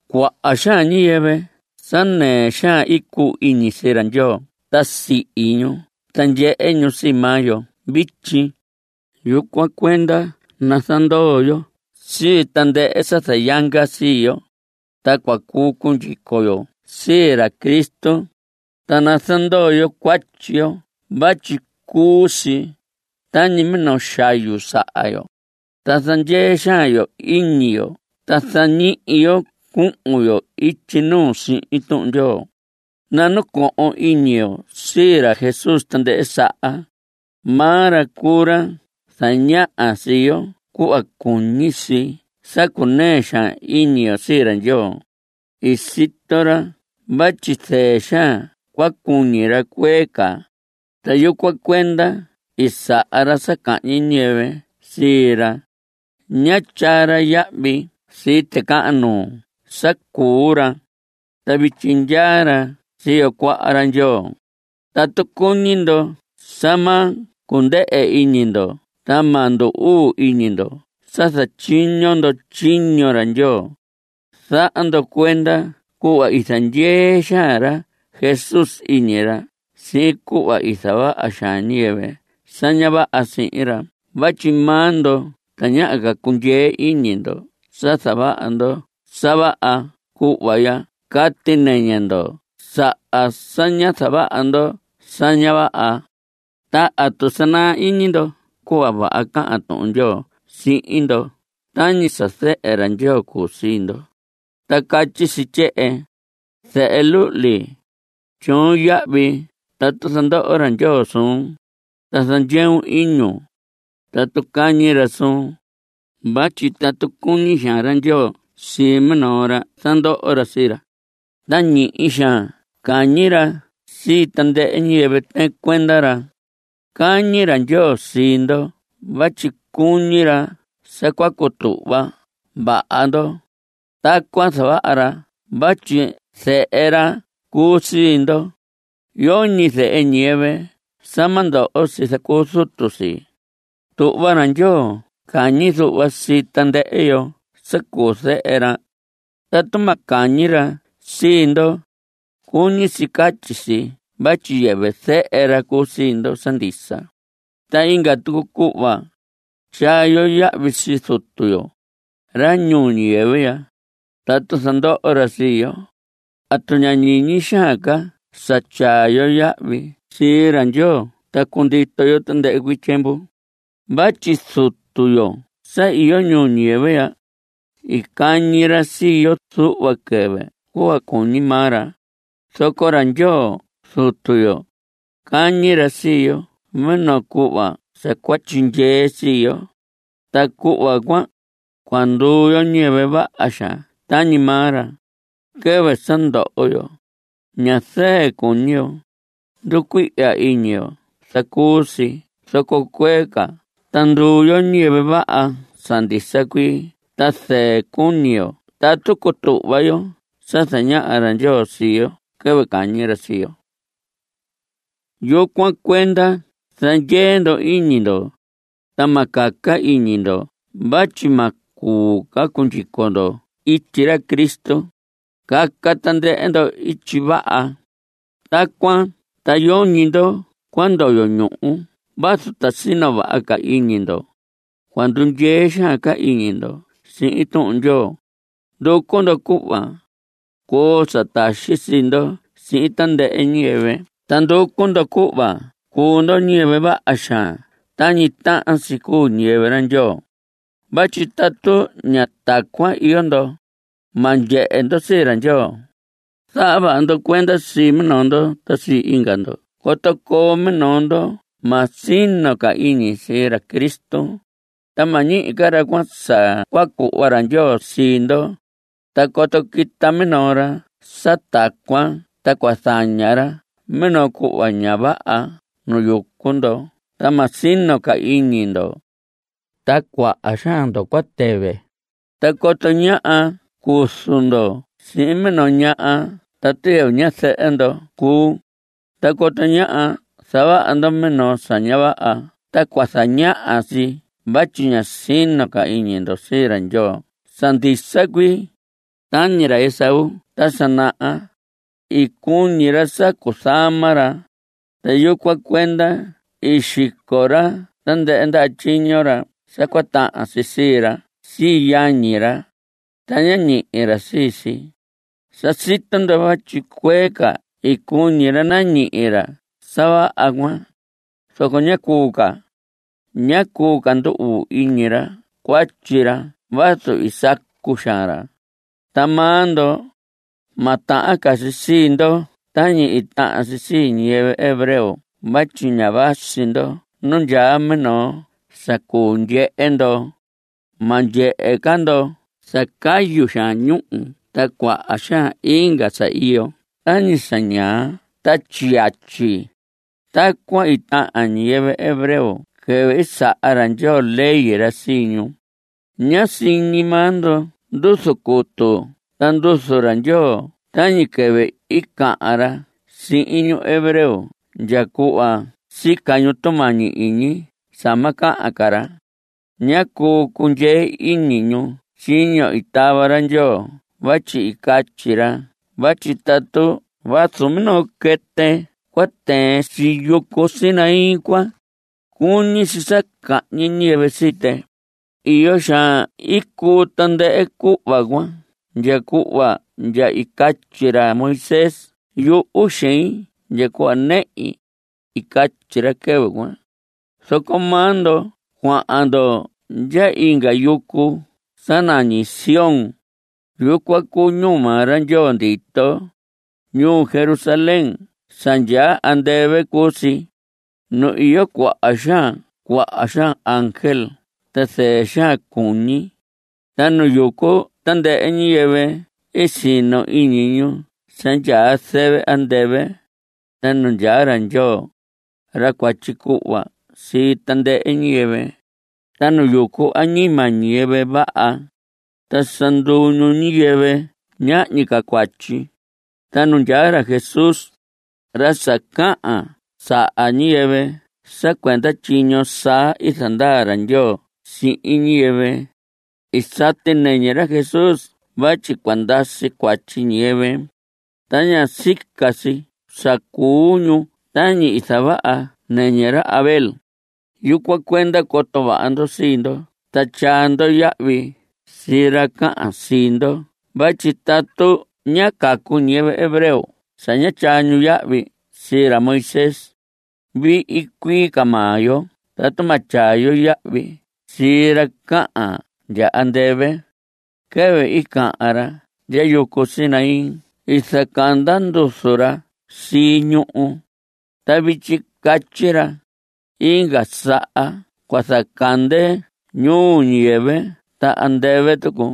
Cuaha xaan ñiyɨvɨ sa nɨɨ xaan i cuu iñi sii ra Ndyoo ta sihi ñu ta ndyehe ñu sii maa yo vityi. Yucuan cuenda nazandoo yo sii tandɨhɨ sa zayanga sii yo, ta cua cuu cundyico yo sii ra Cristo. Ta nazandoo yo cuatyi yo vatyi cuu si tañi minoo xayu saha yo. Ta nazandyee xaan yo iñi yo ta zañihi yo cuhun yo ityi nuu sihin Tuhun Ndyoo. Nanacohon iñi yo sii ra Jesús tandɨhɨ saha. Maa ra cuu ra zañaha sii yo cuhva cuñi si sa cunɨɨ xaan iñi yo sii ra Ndyoo. I sito ra vatyi zɨɨ xaan cua cuñi ra cuee ca, ta yucuan cuenda i saha ra sa cahñi ñiyɨvɨ sii ra. Ñá tyaa ra yahvi sii ticahan nuu sa cuu ra. Ta vityi ndyaa ra siyo cuaha ra Ndyoo. Tatu cuñi ndo sa ma cundɨhɨ iñi ndo ta ma ndu‑uu iñi ndo sa zatyiño ndo tyiño ra Ndyoo, zaha ndo cuenda cuhva i zandyee xaan ra Jesús iñi ra sihin cuhva i zavaha xaan ñiyɨvɨ sa ña vaha sihin ra. Vatyi maa ndo tañaha ca cundyee iñi ndo sa zavaha ndo sa vaha cuhva ndya cati nɨñɨ ndo saha sa ñá zavaha ndo sa ña vaha. Ta ¿atu sa i naa iñi ndo cuhva vaha cahan Tuhun Ndyoo sihin ndo tañi sa zehe ra Ndyoo cuu sii ndo? Ta catyi si tyehen: Zehe luhli, tyoon yahvi tatu zandoho ra Ndyoo suun, Ta zandyeun iñun tatu cañi ra suun; Vatyi tatu cuñi xaan ra Ndyoo sii minoo ra, zandoho ra sii ra, Ta ñihi xaan cañi ra sii tandɨhɨ ñiyɨvɨ tɨɨn cuenda ra. Cañi ra Ndyoo sii ndo vatyi cuñi ra sa cua cutuhva vaha ndo. Tacuan zavaha ra vatyi zehe ra cuu sii ndo. Yoñi zehe ñiyɨvɨ sa ma ndoho si zacuu zutu si. Tuhva ra Ndyoo cañi zuhva sii tandɨhɨ yo sa cuu zehe ra. Tatu ma cañi ra sii ndo, cuñi si catyi si vatyi yɨvɨ zehe ra cuu sii ndo sa ndisa. Ta inga tucu cuhva, tyaa yo yahvi sii zutu yo, ra ñuu ñiyɨvɨ ya, tatu zandoho ra sii yo. ¿Atu ña ñiñi xaan ca sa tyaa yo yahvi sii ra Ndyoo ta cundito yo tandɨhɨ cuii tyiemvu? Vatyi zutu yo sa iyo ñuu ñiyɨvɨ ya, i cañi ra sii yo zuhva quɨvɨ cuhva cuñi maa ra. Zoco ra Ndyoo Zutu yo, cañi ra sii yo minoo cuhva sa cua tyindyee sii yo. Ta cuhva cuan, cua nduu yo ñiyɨvɨ vaha xaan tañi maa ra. Quɨvɨ sa ndoho yo, ña zɨɨ cuñi yo. Nducuihya iñi yo zacuu si. Zoco cuee ca ta nduu yo ñiyɨvɨ vaha sa ndisa cuii ta zɨɨ cuñi yo tatu cutuhva yo sa zañaha ra Ndyoo sii yo quɨvɨ cañi ra sii yo. Yucuan cuenda zandyee ndo iñi ndo, ta ma caca iñi ndo vatyi ma cuu ca cundyico ndo ityi ra Cristo. Caca tandɨhɨ ndo ityi vaha. Tacuan ta yoñi ndo cua ndoyo ñuhu vazu ta sino vaha ca iñi ndo. Cua ndundyee xaan ca iñi ndo sihin Tuhun Ndyoo. Nducu ndo cuhva coo sa taxi sii ndo sihin tandɨhɨ ñiyɨvɨ. Ta nducu ndo cuhva cuu ndo niyɨvɨ vaha xaan tañi tahan si cuu ñiyɨvɨ ra Ndyoo. Vatyi tatu ña tacuan iyo ndo, ma ndyehe ndo sii ra Ndyoo. Zaha vaha ndo cuenda sii minoo ndo ta sii inga ndo coto coo minoo ndoho ma sino ca iñi sii ra Cristo, ta ma ñihi ca ra cuan sa cua cuhva ra Ndyoo sii ndo. Ta coto quita minoo ra sa tacuan ta cua zañaha ra minoo cuhva ña vaha nu yucu ndo ta ma sino ca iñi ndo, ta cuaha xaan ndo cua tɨvɨ. Ta coto ñáha cuzu ndo sihin minoo ñaha tatu yɨvɨ ñazɨhɨ ndo cuu, ta coto ñáha zavaha ndo minoo sa ña vaha ta cua zañaha si vatyi ña sino iñi ndo sii ra Ndyoo sa ndisa cuii. Tañi ra Esaú ta sa naha, i cuñi ra sa cuzama ra, ta yucuan cuenda i xico ra tandɨhɨ ndaha tyiño sa cua tahan si sii ra sii yañi ra, ta ñá ñihi ra sii si. Sa sito ndo vatyi cuee ca i cuñi ra nañihi ra sa vaha cuan, zoco ñá cuu ca. Ñá cuu ca ndu‑uu iñi ra cuatyi ra vazu i sacu xaan ra. Ta maa ndo, ma tahan ca si sii ndo tañi i tahan si sii ñiyɨvɨ hebreo vatyi ña vasi ndo nu ndyaa minoo sa cuu ndyehe ndo. Ma ndyehe ca ndo sa cayu xaan ñúhu ta cuaha xaan inga sa iyo tañi sa ñaa ta tyiyatyi. (Tacuan i tahan ñiyɨvɨ hebreo quɨvɨ i saha ra Ndyoo ley ra sii ñu.) Ñá siñi maa ndo nduzu cutu ta nduzu ra Ndyoo tañi quɨvɨ i cahan ra sihin ñu hebreo ndya cuhva sica ñu tumañi iñi sa ma cahan ca ra. Ñá cuu cundyee iñi ñu tyiño i tava ra Ndyoo vatyi i catyi ra vatyi tatu vazu minoo quɨtɨ cua tɨɨn sii yucu Sinaí cuan, cuñi si sa cahñi ñiyɨvɨ sii tɨ. Iyo xaan i cuu tandɨhɨ cuhva cuan ndya cuhva ndya i catyi ra Moisés: “Yuhu xein ndya cuhva nɨhi.” I catyi ra quɨvɨ cuan. Zoco maa ndo cuahan ndo ndya inga yucu sa nañi Sión. Yucuan cuu ñuu maa ra Ndyoo ndito. Ñuu Jerusalén sa ndyaa andɨvɨ cuu si. Nu iyo cuaha xaan cuaha xaan ángel sa zɨɨ xaan cuñi. Ta nu yucu tandɨhɨ ñiyɨvɨ sino iñi, ñu sa ndyaa zɨvɨ andɨvɨ. Ta nu ndyaa ra Ndyoo, ra cua tyicuhva sii tandɨhɨ ñiyɨvɨ, ta nu yucu añima ñiyɨvɨ vaha, ta sa nduu ñu ñiyɨvɨ ñahñi ca cuatyi. Ta nu ndyaa ra Jesús, ra sa cahan saha ñiyɨvɨ sa cuenda tyiño saa i zandaa ra Ndyoo sihin ñiyɨvɨ. I sati nɨñɨ ra Jesús vatyi cua ndasi cuatyi ñiyɨvɨ, ta ña sica si sa cuu ñu tañi i zavaha nɨñɨ ra Abel. Yucuan cuenda coto vaha ndo sii ndo ta tyaa ndo yahvi sii ra cahan sihin ndo vatyi tatu ñá cacu ñiyɨvɨ hebreo sa ñá tyaa ñu yahvi sii ra Moisés, vihi cuii ca maa yo tatu ma tyaa yo yahvi sii ra cahan ndya andɨvɨ. Quɨvɨ i cahan ra ndya Yucu Sinaí i zacanda nduzu ra sii ñuhu. Ta vityi catyi ra: “Inga saha cua zacande ñuhu ñuu ñiyɨvɨ ta andɨvɨ tucu.”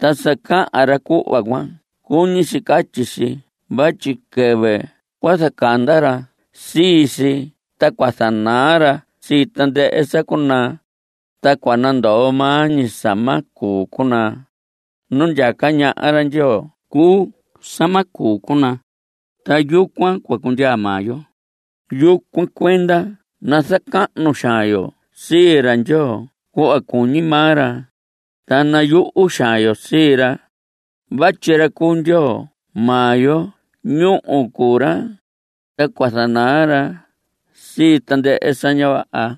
Ta sa cahan ra cuhva cuan cuñi si catyi si vatyi quɨvɨ cua zacanda ra sii si ta cua zanaa ra sii tandɨhɨ sa cuu naa, ta cua nandoo maa ñi sa ma cuu cunaa. Nu ndyaca ñaha ra Ndyoo cuu sa ma cuu cunaa, ta yucuan cua cundyaa maa yo. Yucuan cuenda nazacahnu xaan yo sii ra Ndyoo cuhva cuñi maa ra. Ta nayuhu xaan yo sii ra. Vatyi ra cu Ndyoo maa yo ñúhu cuu ra, ta cua zanaa ra sii tandɨhɨ sa ña vaha.